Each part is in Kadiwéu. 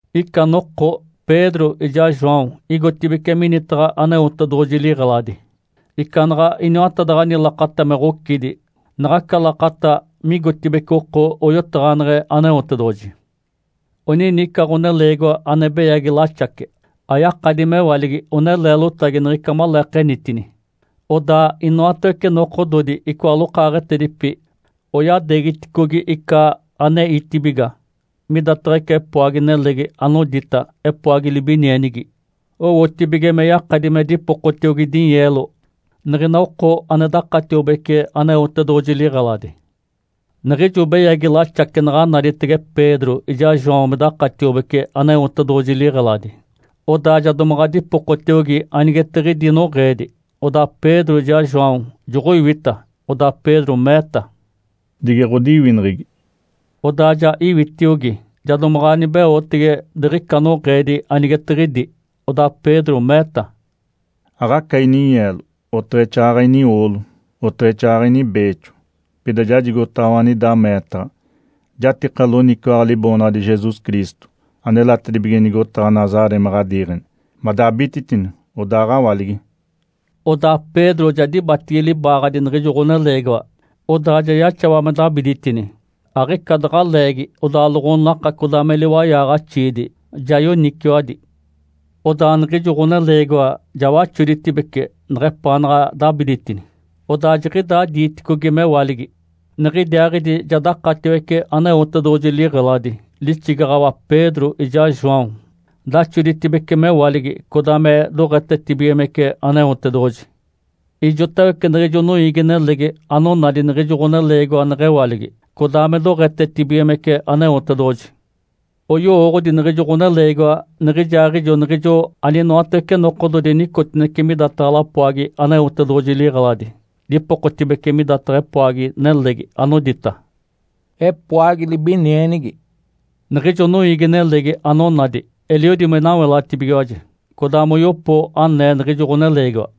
Ica noko Pedro ijaa João igotibeci minitaɡ̶a Aneotedoɡ̶oji liɡ̶eladi ica naɡ̶a iniwatadaɡ̶ani lakata me ɡ̶ocidi, naɡ̶aca lakata migotibeci oko oyotaɡ̶aneɡ̶e Aneotedoɡ̶oji. Onini ica ɡ̶oneleegiwa ane beyagi laxace, ayakadi mewaligi one leelotagi niɡ̶ica maleekenitini. Odaa inoatawece nokododi icoa lokaaɡ̶etedipi oyadeegiticogi ica aneitibiga midataɡ̶a ica epoagi-nelegi anodita “Epoagi libinienigi”, owotibige me yakadi me dipokotiogi dinyeelo niɡ̶ina oko ane dakatiobece Aneotedoɡ̶oji liɡ̶eladi. Niɡ̶ijo beyagi laxace naɡ̶a naditege Pedro ijaa João me dakatiobece Aneotedoɡ̶oji liɡ̶eladi, odaa ja domaɡ̶a dipokotiogi anigetiɡ̶idi noɡ̶eedi. Odaa Pedro ijaa João joɡ̶oiwita, odaa Pedro meeta, “Dige ɡ̶odiwineɡ̶egi!” Odaa ja iwitiogi, ja domaɡ̶a nibeotege diɡ̶ica noɡ̶eedi anigetiɡ̶idi. Odaa Pedro meeta, “Aɡ̶aca ininyeelo, oteɡ̶exaaɡ̶aɡ̶a inioolo, oteɡ̶exaaɡ̶aɡ̶a inibeexo, pida jajigotaɡ̶awa anida meetaɡ̶a. Jatika loniciwaɡ̶a Liboonaɡ̶adi Jesus Cristo anelatedibige nigotaɡ̶a Nazaré me ɡ̶adiiɡ̶eni madabititini, odaaɡ̶awaligi!” Odaa Pedro ja dibatigi libaaɡ̶adi niɡ̶ijo ɡ̶oneleegiwa, odaa ja yaxawa me dabiditini. Aɡ̶ica daɡ̶a leegi odaa loɡ̶onaka codaa me liwayaɡ̶axiidi ja yoniciwadi. Odaa niɡ̶ijo ɡ̶oneleegiwa ja waxoditibece neɡ̶epaanaɡ̶a dabiditini, odaa jiɡ̶idaa diiticogi mewaligi. Niɡ̶idiaaɡ̶idi ja dakatiwece Aneotedoɡ̶oji liɡ̶eladi, lixigaɡ̶awa Pedro ijaa João, daxoditibece mewaligi, codaa me doɡ̶etetibigimece Aneotedoɡ̶oji. Ijotawece niɡ̶ijo noiigi-nelegi onadi niɡ̶ijo ɡ̶oneleegiwa neɡ̶ewaligi, codaa me doɡ̶etetibigimece Aneotedoɡ̶oji. Oyowooɡ̶odi niɡ̶ijo ɡ̶oneleegiwa niɡ̶ijaaɡ̶ijo niɡ̶ijo aninoatawece nokododi nicotinece midataɡ̶a lapoagi Aneotedoɡ̶oji liɡ̶eladi, dipokotibece midataɡ̶a epoagi-nelegi anodita “Epoagi Libinienigi”. Niɡ̶ijo noiigi-nelegi anonadi eliodi me nawelatibigiwaji, codaa moyopo anee niɡ̶ijo ɡ̶oneleegiwa.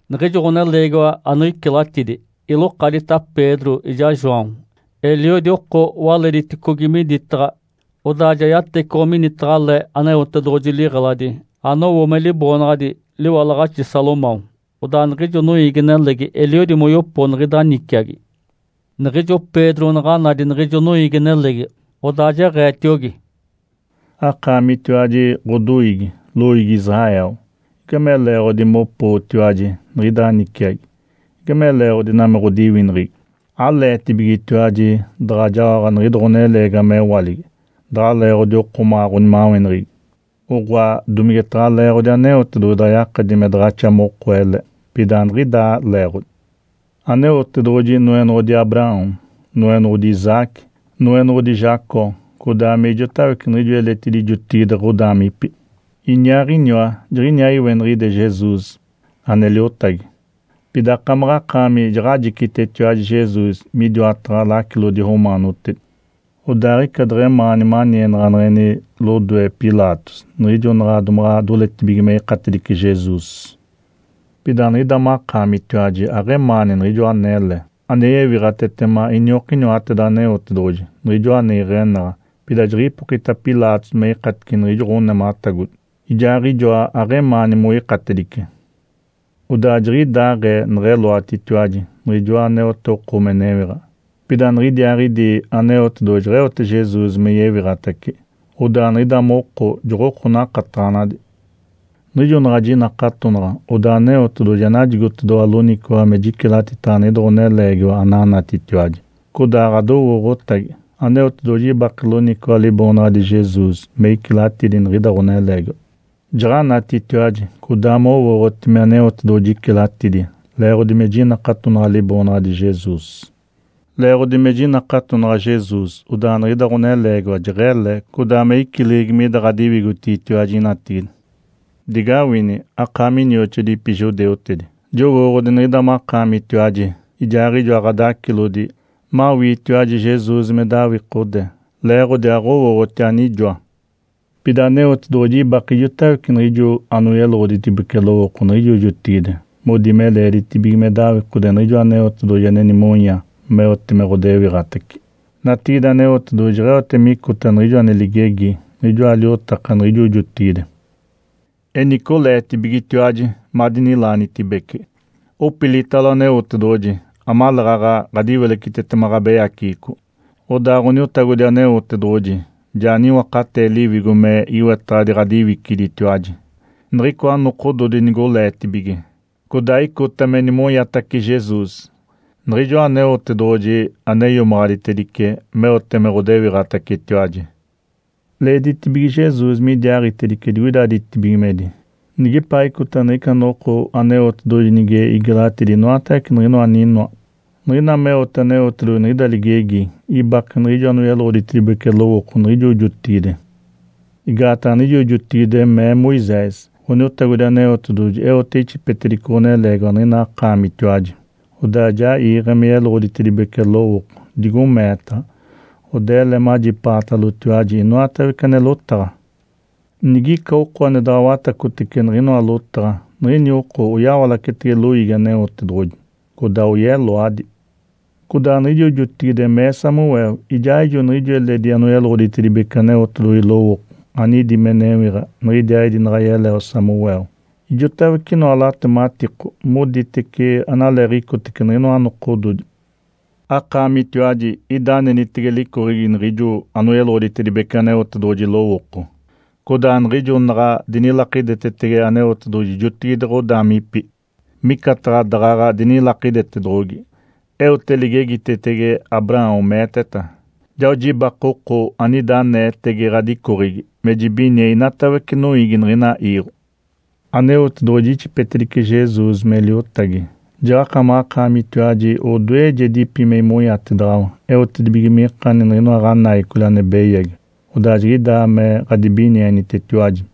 Niɡ̶ijo ɡ̶oneleegiwa anoicilatidi ilokadita Pedro ijaa João. Eliodi oko walediticogi miditaɡ̶a, odaa ja yatecoɡ̶o minitaɡ̶a le Aneotedoɡ̶oji liɡ̶eladi anowo me liboonaɡ̶adi “Liwalaɡ̶axi Salomão”. Odaa niɡ̶ijo noiigi-nelegi eliodi moyopo niɡ̶ida niciagi. Niɡ̶ijo Pedro naɡ̶a nadi niɡ̶ijo noiigi-nelegi, odaa jeɡ̶eetiogi, “Akaamitiwaji ɡ̶odoiigi, loiigi Israel, igame leeɡ̶odi mopootiwaji niɡ̶ida niciagi? Igame leeɡ̶odi ina me ɡ̶odiwineɡ̶egi? Aleetibigetiwaji daɡ̶a jaoɡ̶a niɡ̶ida ɡ̶oneleegiwa mewaligi daɡ̶a leeɡ̶odi okomaɡ̶a ɡ̶onimaweneɡ̶egi, oɡ̶oa, domigetaɡ̶a leeɡ̶odi Aneotedoɡ̶oji daɡ̶a yakadi me daɡ̶axa moko ele? Pida aniɡ̶idaa leeɡ̶odi! Aneotedoɡ̶oji Noenoɡ̶odi Abraão, Noenoɡ̶odi Isaque, Noenoɡ̶odi Jacó codaa me ijotawece niɡ̶ijo eledi jotigide ɡ̶odaamipi. Iniaaɡ̶iniwa jiɡ̶iniaa iweniɡ̶ide Jesus ane Liotagi. Pida akamaɡ̶akaami jaɡ̶ajicitetiwaji Jesus midiwataɡ̶a lacilodi romaanotedi, odaa aɡ̶ica deɡ̶emaani manienaɡ̶aneɡ̶eni lodoe Pilatos niɡ̶ijo naɡ̶a domaɡ̶a doletibige me ikatedice Jesus. Pida niɡ̶ida makaamitiwaji aɡ̶emaani Niɡ̶ijoa anele, ane yewiɡ̶atetema iniokiniwateda Aneotedoɡ̶oji, Niɡ̶ijoa ane iɡ̶enaɡ̶a. Pida jiɡ̶ipokita Pilatos me ikatice niɡ̶ijo ɡ̶onematagodi, ijaaɡ̶ijoa aɡ̶emaani moikatedice. Odaa jiɡ̶idaaɡ̶ee neɡ̶eloatitiwaji Niɡ̶ijoa aneote oko me newiɡ̶a. Pida niɡ̶idiaaɡ̶idi Aneotedoɡ̶oji jeɡ̶eote Jesus me yewiɡ̶atace, odaa niɡ̶ida moko joɡ̶oko nakataɡ̶anadi. Niɡ̶ijo naɡ̶a jinakatonaɡ̶a, odaa Aneotedoɡ̶oji ja najigotedoɡ̶owa loniciwaɡ̶a me jicilatitaɡ̶a niɡ̶ida ɡ̶oneleegiwa ananatitiwaji, codaa ɡ̶adowooɡ̶otagi. Aneotedoɡ̶oji ibake loniciwaɡ̶a Liboonaɡ̶adi Jesus me icilatidi niɡ̶ida ɡ̶oneleegiwa. Jaɡ̶anatitiwaji codaa mowooɡ̶oti me Aneotedoɡ̶oji icilatidi leeɡ̶odi me jinakatonaɡ̶a Liboonaɡ̶adi Jesus. Leeɡ̶odi me jinakatonaɡ̶a Jesus odaa niɡ̶ida ɡ̶oneleegiwa jeɡ̶ele codaa me icileɡ̶egi mida ɡ̶adiwigotigitiwaji natigide. Digawini, akaami inioxoadipi judeutedi, jowooɡ̶odi niɡ̶ida makaamitiwaji ijaaɡ̶ijoa ɡ̶adacilodi mawiitiwaji Jesus me dawikode leeɡ̶odi aɡ̶owooɡ̶oti anijoa. Pida Aneotedoɡ̶oji ibake ijotawece niɡ̶ijo anoyeloɡ̶oditedibece lowooko niɡ̶ijo jotigide modi me leeditibige me dawikode Niɡ̶ijoa Aneotedoɡ̶oji ane nimonya meote me ɡ̶odewiɡ̶atace. Natigide Aneotedoɡ̶oji jeɡ̶eote micota niɡ̶ijo ane ligegi niɡ̶ijoa liotaka niɡ̶ijo jotigide. Enice oleetibigetiwaji madinilaanitibece, opilitalo Aneotedoɡ̶oji amaleeɡ̶aɡ̶a ɡ̶adiwilecitetema ɡ̶abeyaceɡ̶eco, odaa Ǥoniotagodi Aneotedoɡ̶oji ja niwakatee Liwigo me iwetaɡ̶adi ɡ̶adiwiciditiwaji niɡ̶icoa nokododi nigoleetibige, codaa icota me nimonyatace Jesus, Niɡ̶ijoa Aneotedoɡ̶oji ane iomaɡ̶aditedice meote me ɡ̶odewiɡ̶atacetiwaji. Leeditibige Jesus midiaaɡ̶itedice digoida ditibigimedi nigepaaɡ̶icota niɡ̶ica noko Aneotedoɡ̶oji nige igelaɡ̶atidi inoatawece niɡ̶inoa aninoa. Niɡ̶ina meote Aneotedoɡ̶oji niɡ̶ida ligegi ibake niɡ̶ijo anoyeloɡ̶oditedibece lowooko niɡ̶ijo jotigide. Igaataɡ̶a niɡ̶ijo jotigide mee Moisés, ‘Ǥoniotagodi Aneotedoɡ̶oji eote ixipetedice ɡ̶oneleegiwa niɡ̶ina akaamitiwaji, odaa ja iiɡ̶e me yeloɡ̶oditedibece lowooko, digo meetaɡ̶a. Odaa ele majipaatalotiwaji inoatawece ane lotaɡ̶a. Nigica oko ane daɡ̶a watacotece niɡ̶inoa lotaɡ̶a, niɡ̶ini oko oyawalacetege loiigi Aneotedoɡ̶oji, codaa oyeloadi.’ Codaa niɡ̶ijo jotigide mee Samuel ijaaɡ̶ijo niɡ̶ijo eledi anoyeloɡ̶oditedibece Aneotedoɡ̶oji lowooko anidi me newiɡ̶a niɡ̶idiaaɡ̶idi naɡ̶a yeleo Samuel, ijotawece inoa latematiko moditece analeeɡ̶icotece niɡ̶inoa nokododi. Akaamitiwaji ida anenitege licoɡ̶egi niɡ̶ijo anoyeloɡ̶oditedibece Aneotedoɡ̶oji lowooko, codaa niɡ̶ijo naɡ̶a dinilakidetetege Aneotedoɡ̶oji jotigide ɡ̶odaamipi, micataɡ̶a daɡ̶aɡ̶a dinilakidetedoɡ̶ogi. Eote ligegitetege Abraão, meeteta, ‘Jao jibake oko anida aneetege ɡ̶adicoɡ̶egi me jibinie inatawece noiigi niɡ̶ina iiɡ̶o.’ Aneotedoɡ̶oji ixipetedice Jesus me Liotagi, jaɡ̶akamaɡ̶akaamitiwaji odoejedipi me imonyatedaɡ̶awa eotedibige mikani niɡ̶inoa ɡ̶anaicoli ane beyagi, odaa jiɡ̶idaa me ɡ̶adibinienitetiwaji.”